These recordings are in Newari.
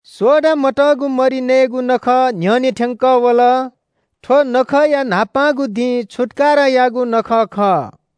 सोडा मतःगु मरि नयेगु नखः न्‍ह्यःने थ्‍यंकः वल। थ्‍व नखःया न्‍हापांगु दिं छुत्‍काराया नखः खः।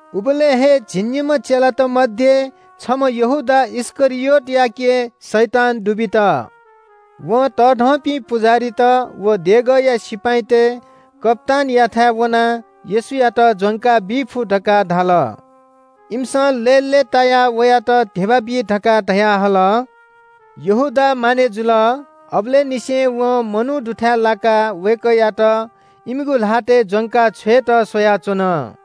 उबलय् हे झिंनिम्‍ह चेलात मध्‍ये छम्‍ह यहूदा इस्‍करियोतयाके शैतान दुबित। वं तःधंपिं पुजाहारीत व देगःया सिपाइँतय् कप्‍तानयाथाय् वनाः येशूयात ज्‍वंका बी फु धकाः धाल। इमिसं लय्‌लय्‌तायाः वयात धिबा बी धकाः धयाहल। यहूदा मानय् जुल। अबलय् निसें वं मनू मदुथाय् लाकाः वय्‌कःयात इमिगु ल्‍हातय् ज्‍वंका छ्वयेत स्‍वयाच्‍वन।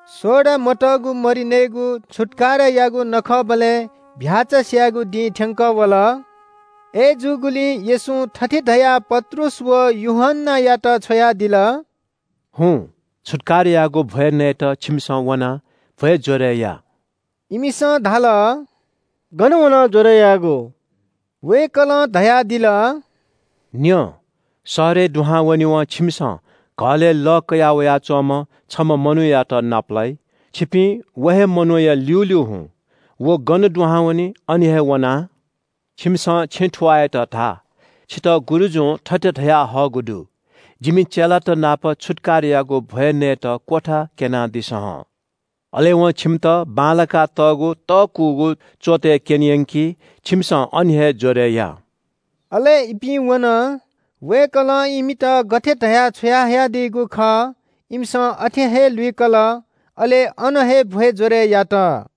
सोडा मतःगु मरि नयेगु छुत्‍कारायागु नखःबलय् चीधिकःम्‍ह भ्‍याःचा स्‍यायेगु दिं थ्‍यंकः वल। अय्‌जूगुलिं येशूं थथे धयाः पत्रुस व यूहन्‍नायात छ्वयादिल – “हुँ, छुत्‍काराया नखःया भ्‍वय् नयेत छिमिसं वनाः भ्‍वय् ज्‍वरय् या।” इमिसं धाल – “गन वनाः ज्‍वरय् यायेगु?” वय्‌कलं धयादिल – “न्‍यँ, शहरय् दुहां वनेवं छिमिसं घलय् लः कया वयाच्‍वंम्‍ह छम्‍ह मनूयात नापलाइ। छिपिं व हे मनूया ल्‍यूल्‍यू हुँ। व गन दुहां वनी, अन हे वनाः छिमिसं छेँ थुवाःयात धा – ‘छितः गुरुजुं थथे धयाहःगु दु – “जिमि चेलात नाप छुत्‍काराया नखःया भ्‍वय् नयेत क्‍वथा क्‍यनादिसँ हं।”’ अले वं छिमित बांलाकातःगु तःकूगु च्‍वतय् क्‍यने यंकी, छिमिसं अन हे ज्‍वरय् या।” अले इपिं वन। वय्‌कलं इमित गथे धया छ्वयादीगु खः, इमिसं अथे हे लुइकल, अले अन हे छुत्‍काराया नखःया भ्‍वय् ज्‍वरय् यात।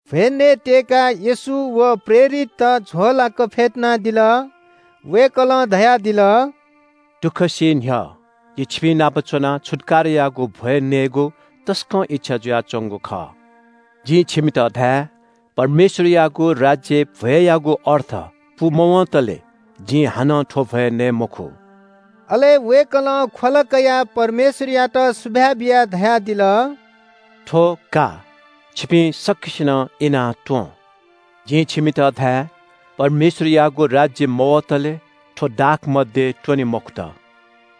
भ्‍वय् नयेत्‍यय्‌काः येशू व प्रेरितत झ्‍वःलाक फ्‍यतुनादिल। वय्‌कलं धयादिल – “दुःख सी न्‍ह्यः जि छिपिंनाप च्‍वनाः छुत्‍काराया नखःया भ्‍वय् नयेगु तसकं इच्‍छा जुयाच्‍वंगु खः। जिं छिमित धाये – परमेश्‍वरयागु राज्‍यय् भ्‍वय्‌यागु अर्थ पूमवंतले जिं हानं थ्‍व भ्‍वय् नये मखु।” अले वय्‌कलं ख्‍वला कयाः परमेश्‍वरयात सुभाय् बियाः धयादिल – “थ्‍व का, छिपिं सकसिनं इनाः त्‍वँ। जिं छिमित धाये – परमेश्‍वरयागु राज्‍य मवतले थ्‍व दाखमद्य त्‍वने मखुत।”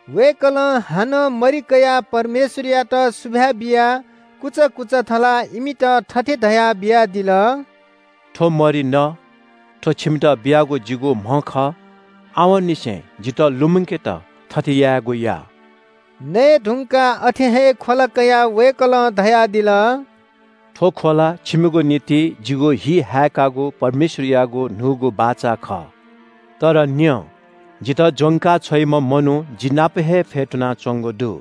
वय्‌कलं हानं मरि कयाः परमेश्‍वरयात सुभाय् बियाः कुचा कुचा थलाः इमित थथे धयाः बियादिल – “थ्‍व मरि न। थ्‍व छिमित बियागु जिगु म्‍ह खः। आवंनिसें जितः लुमंकेत थथे यायेगु या।” नये धुंकाः अथे हे ख्‍वला कयाः वय्‌कलं धयादिल – “थ्‍व ख्‍वला छिमिगु निंतिं जिगु हि हाय्‌कागु परमेश्‍वरयागु न्‍हूगु बाचा खः। “तर न्‍यँ, जितः ज्‍वंका छ्वइम्‍ह मनू जि नाप हे फ्‍यतुनाच्‍वंगु दु।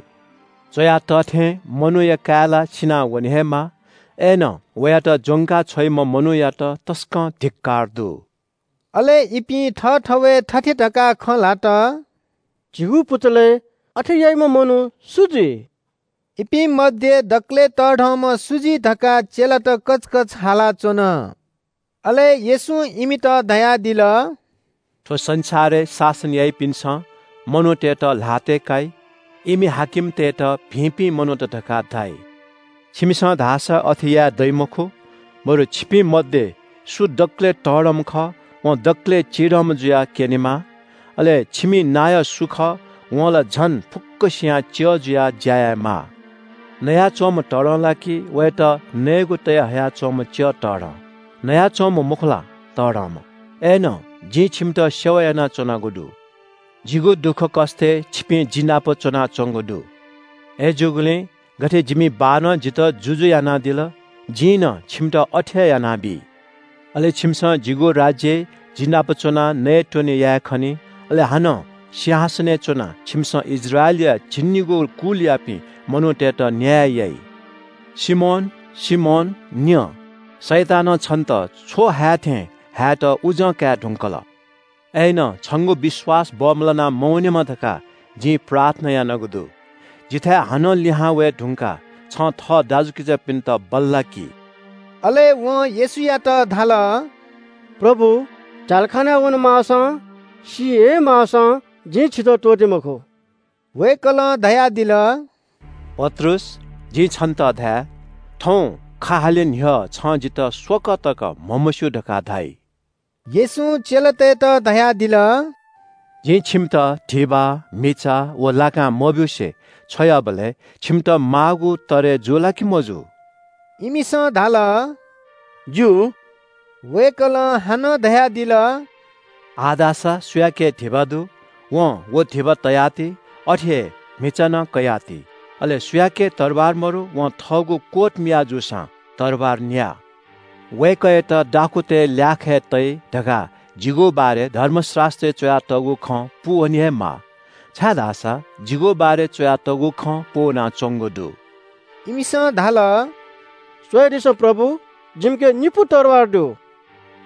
च्‍वया तः थें मनूया काय् ला सिनावने हे माः। अय्‌नं वयात ज्‍वंका छ्वइम्‍ह मनूयात तसकं धिक्‍कार दु।” अले इपिं थःथवय् थथे धकाः खँ ल्‍हात – “झीगु पुचलय् अथे याइम्‍ह मनू सु जुइ?” इपिं मध्‍ये दकलय् तःधंम्‍ह सु जुइ धकाः चेलात कचकच हालाच्‍वन। अले येशूं इमित धयादिल – “थ्‍व संसारय् शासन याइपिन्‍सं मनूतय्‌त ल्‍हातय् काइ। इमि हाकिमतय्‌त भिंपिं मनूत धकाः धाइ। छिमिसं धाःसा अथे यायेदइ मखु, बरु छिपिं मध्‍ये सु दकलय् तःधंम्‍ह खः वं दकलय् चिधंम्‍ह जुयाः क्‍यनेमाः। अले छिमि नायः सु खः वं ला झन फुक्‍कसियां च्‍यः जुयाः ज्‍या यायेमाः। नयाच्‍वंम्‍ह तःधं ला कि वयात नयेगु तये हया च्‍वंम्‍ह च्‍यः तःधं? नयाच्‍वंम्‍ह मखु ला, तःधंम्‍ह? अय्‌नं जिं छिमित सेवा यानाच्‍वनागु दु। “जिगु दुःखकष्‍टय् छिपिं जि नाप च्‍वनाच्‍वंगु दु। अय्‌जूगुलिं गथे जिमि बाःनं जितः जुजु यानादिल, जिं नं छिमित अथे हे यानाबी। अले छिमिसं जिगु राज्‍यय् जि नाप च्‍वनाः नयेत्‍वने याये खनी। अले हानं सिंहासनय् च्‍वनाः छिमिसं इस्राएलया झिंनिगू कुलयापिं मनूतय्‌त न्‍याय याइ।” “सिमोन, सिमोन न्‍यँ, शैतानं छिमित छ्व हाये थें हायेत उजं काये धुंकल। अय्‌नं छंगु विश्‍वास बमलाना मवनेमा धकाः जिं प्रार्थना यानागु दु। जिथाय् हानं लिहां वये धुंकाः छं थः दाजुकिजापिन्‍त बल्‍लाकि।” अले वं येशूयात धाल – “प्रभु, झ्‍यालखानाय् वनेमाःसां, सी हे माःसां जिं छितः त्‍वःते मखु।” वय्‌कलं धयादिल – “पत्रुस, जिं छन्‍त धाये – थौं खा हाले न्‍ह्यः छं जितः स्‍वकः तक म्‍हमस्‍यू धकाः धाइ।” येशूं चेलातय्‌त धयादिल – “जिं छिमित धिबा, म्‍हिचा व लाकां मब्‍यूसे छ्वयाबलय् छिमित माःगु तरय् जू ला कि मजू?” इमिसं धाल – “जू।” वय्‌कलं हानं धयादिल – “आः धाःसा सुयाके धिबा दु, वं व धिबा तयाति, अथे हे म्‍हिचा नं कयाः ति। अले सुयाके तरवार मदु वं थःगु कोट मिया जूसां तरवार न्‍या। ‘वय्‌कःयात दाखुँतय् ल्‍याखय् तइ’ धकाः जिगु बारे धर्मशास्‍त्रय् च्‍वयातःगु खँ पूवने हे माः। छाय्‌धाःसा जिगु बारे च्‍वयातःगु खँ पूवनाच्‍वंगु दु।” इमिसं धाल – “स्‍वयादिसँ प्रभु, जिमिके निपु तरवार दु।”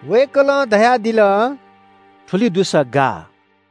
वय्‌कलं धयादिल – “थुलि दुसा गाः।”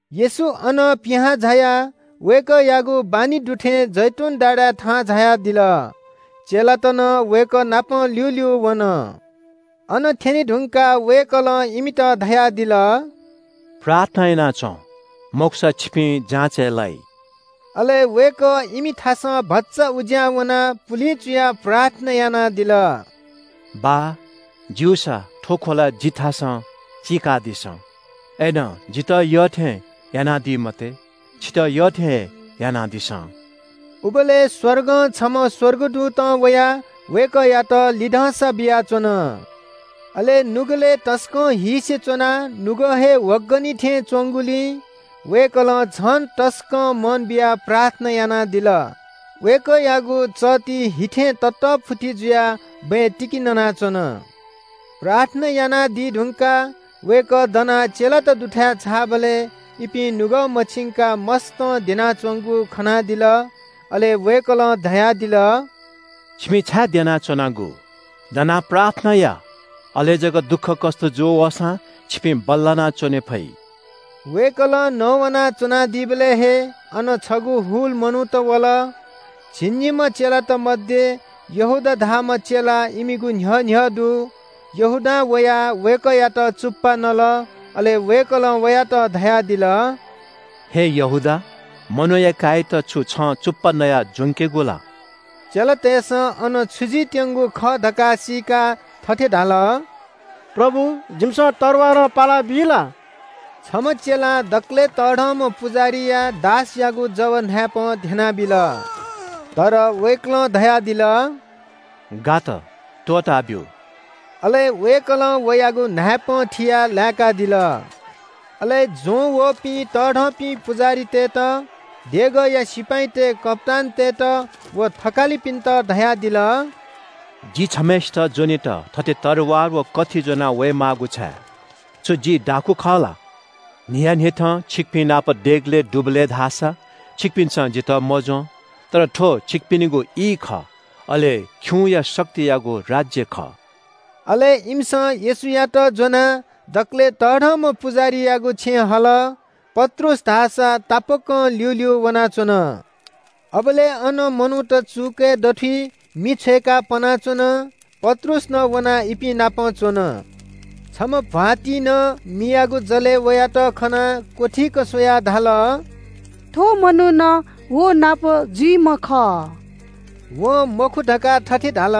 येशू अनं पिहां झायाः वय्‌कःयागु बानी दु थें जैतून डाँडाय् थाहां झायादिल। चेलात नं वय्‌कः नाप ल्‍यूल्‍यू वन। अन थ्‍यने धुंकाः वय्‌कलं इमित धयादिल – “प्रार्थना याना च्‍वँ, मखुसा छिपिं जाँचय् लाइ।” अले वय्‌कः इमिथासं भचा उज्‍यां वनाः पुलिं चुयाः प्रार्थना यानादिल। “बाः, ज्‍यूसा थ्‍व ख्‍वला जिथासं चीकादिसँ। अय्‌नं जितः यःथें यानादी मते, छितः यःथें हे यानादिसँ।” उबलय् स्‍वर्गं छम्‍ह स्‍वर्गदूतं वयाः वय्‌कःयात लिधंसा बियाच्‍वन। अले नुगलय् तसकं हीसे च्‍वनाः नुगः हे ह्वगनि थें च्‍वंगुलिं वय्‌कलं झन तसकं मन बियाः प्रार्थना यानादिल। वय्‌कःयागु चःति हि थें ततःफुति जुयाः बँय् तिकि ननाच्‍वन। प्रार्थना यानादी धुंकाः वय्‌कः दनाः चेलात दुथाय् झाःबलय् इपिं नुगः मछिंकाः मस्‍तं द्यनाच्‍वंगु खनादिल। अले वय्‌कलं धयादिल – “छिपिं छाय् द्यनाच्‍वनागु? दनाः प्रार्थना या। अले जक दुःखकष्‍ट जू वःसां छिपिं बल्‍लाना च्‍वने फइ।” वय्‌कलं नवाना च्‍वनादीबलय् हे अन छगू हुल मनूत वल। झिंनिम्‍ह चेलात मध्‍ये यहूदा धाःम्‍ह चेला इमिगु न्‍ह्यः न्‍ह्यः दु। यहूदां वयाः वय्‌कःयात चुप्‍पा नल। अले वय्‌कलं वयात धयादिल – “हे यहूदा, मनूया काय्‌यात छु छं चुप्‍पा नयाः ज्‍वंकेगु ला?” चेलातय्‌सं अन छु जुइत्‍यंगु खः धकाः सीकाः थथे धाल – “प्रभु, जिमिसं तरवारं पालाबी ला?” छम्‍ह चेलां दकलय् तःधंम्‍ह पुजाहारीया दासयागु जव न्‍हाय्‌पं ध्‍यनाबिल। तर वय्‌कलं धयादिल – “गात, त्‍वःताब्‍यु।” अले वय्‌कलं वयागु न्‍हाय्‌पं थियाः लाय्‌कादिल। अले ज्‍वंवःपिं तःधंपिं पुजाहारीतय्‌त, देगःया सिपाइँतय् कप्‍तानतय्‌त व थकालिपिन्‍त धयादिल – “जि छम्‍हय्‌सित ज्‍वनेत थथे तरवार व कथि ज्‍वनावये माःगु छाय्? छु जि दाखुँ खः ला? न्‍हियान्‍हिथं छिकपिं नाप देगलय् दुबलय् धाःसा छिकपिन्‍सं जितः मज्‍वं। तर थ्‍व छिकपिनिगु ई खः, अले खिउँया शक्तियागु राज्‍य खः।” अले इमिसं येशूयात ज्‍वनाः दकलय् तःधंम्‍ह पुजाहारीयागु छेँय् हल। पत्रुस धाःसा तापाकं ल्‍यूल्‍यू वनाच्‍वन। अबलय् अन मनूत चुकय् दथुइ मि छ्वय्‌काः पनाच्‍वन। पत्रुस नं वनाः इपिं नाप च्‍वन। छम्‍ह भ्‍वातिं नं मियागु जलय् वयात खनाः क्‍वथीक स्‍वयाः धाल – “थ्‍व मनू नं व नाप जुइम्‍ह खः।” वं मखु धकाः थथे धाल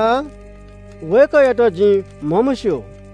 – “वय्‌कःयात जिं म्‍हमस्‍यू।”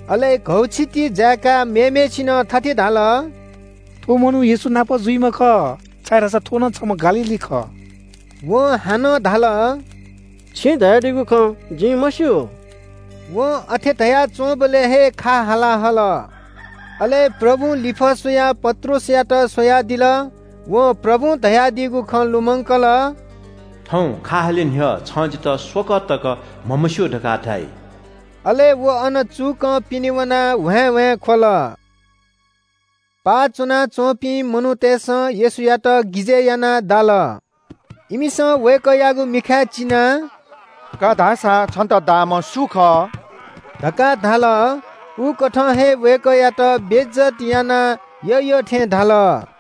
अले घौछिति जाय्‌काः मेम्‍हय्‌सिनं थथे धाल – “थ्‍व मनू येशू नाप जुइम्‍ह खः, छाय्‌धाःसा थ्‍व नं छम्‍ह गालीली खः।” वं हानं धाल – “छिं धयादीगु खँ जिं मस्‍यू।” वं अथे धयाच्‍वंबलय् हे खा हाला हाल। अले प्रभुं लिफः स्‍वयाः पत्रुसयात स्‍वयादिल। वं प्रभुं धयादीगु खँ लुमंकल – “थौं खा हाले न्‍ह्यः छं जितः स्‍वकः तक म्‍हमस्‍यू धकाः धाइ।” अले व अन चुकं पिने वनाः ह्वाँय्‌ह्वाँय् ख्‍वल। पाः च्‍वनाच्‍वंपिं मनूतय्‌सं येशूयात गिजय् यानाः दाल। इमिसं वय्‌कःयागु मिखाय् चिनाः “का धा सा, छन्‍त दाःम्‍ह सु खः?” धकाः धाल। उकथं हे वय्‌कःयात बेइज्‍जत यानाः यःयःथें धाल।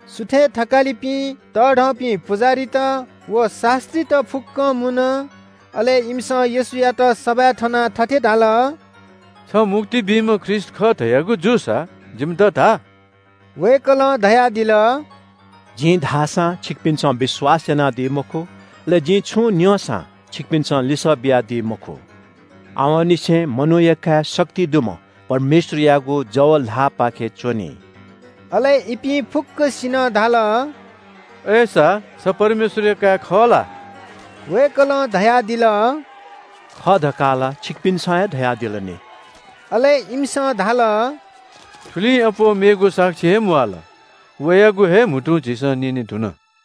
सुथय् थकालिपिं, तःधंपिं पुजाहारीत व शास्‍त्रीत फुक्‍कं मुन। अले इमिसं येशूयात सभाय् थनाः थथे धाल – “छ मुक्ति बीम्‍ह ख्रीष्‍ट खः धयागु जूसा जिमित धा।” वय्‌कलं धयादिल – “जिं धाःसां छिकपिन्‍सं विश्‍वास यानादी मखु। अले जिं छुं न्‍यंसां छिकपिन्‍सं लिसः बियादी मखु। आवंनिसें मनूया काय् शक्ति दुम्‍ह परमेश्‍वरयागु जव ल्‍हाःपाखे च्‍वनी।” अले इपिं फुक्‍कसिनं धाल – “अय्‌सा छ परमेश्‍वरया काय् खः ला?” वय्‌कलं धयादिल – “खः धकाः ला छिकपिन्‍सं हे धयादिल नि।” अले इमिसं धाल – “थुलिं अप्‍वः मेगु साक्षी हे म्‍वाःल। वयागु हे म्‍हुतुं झीसं न्‍यनेधुन।”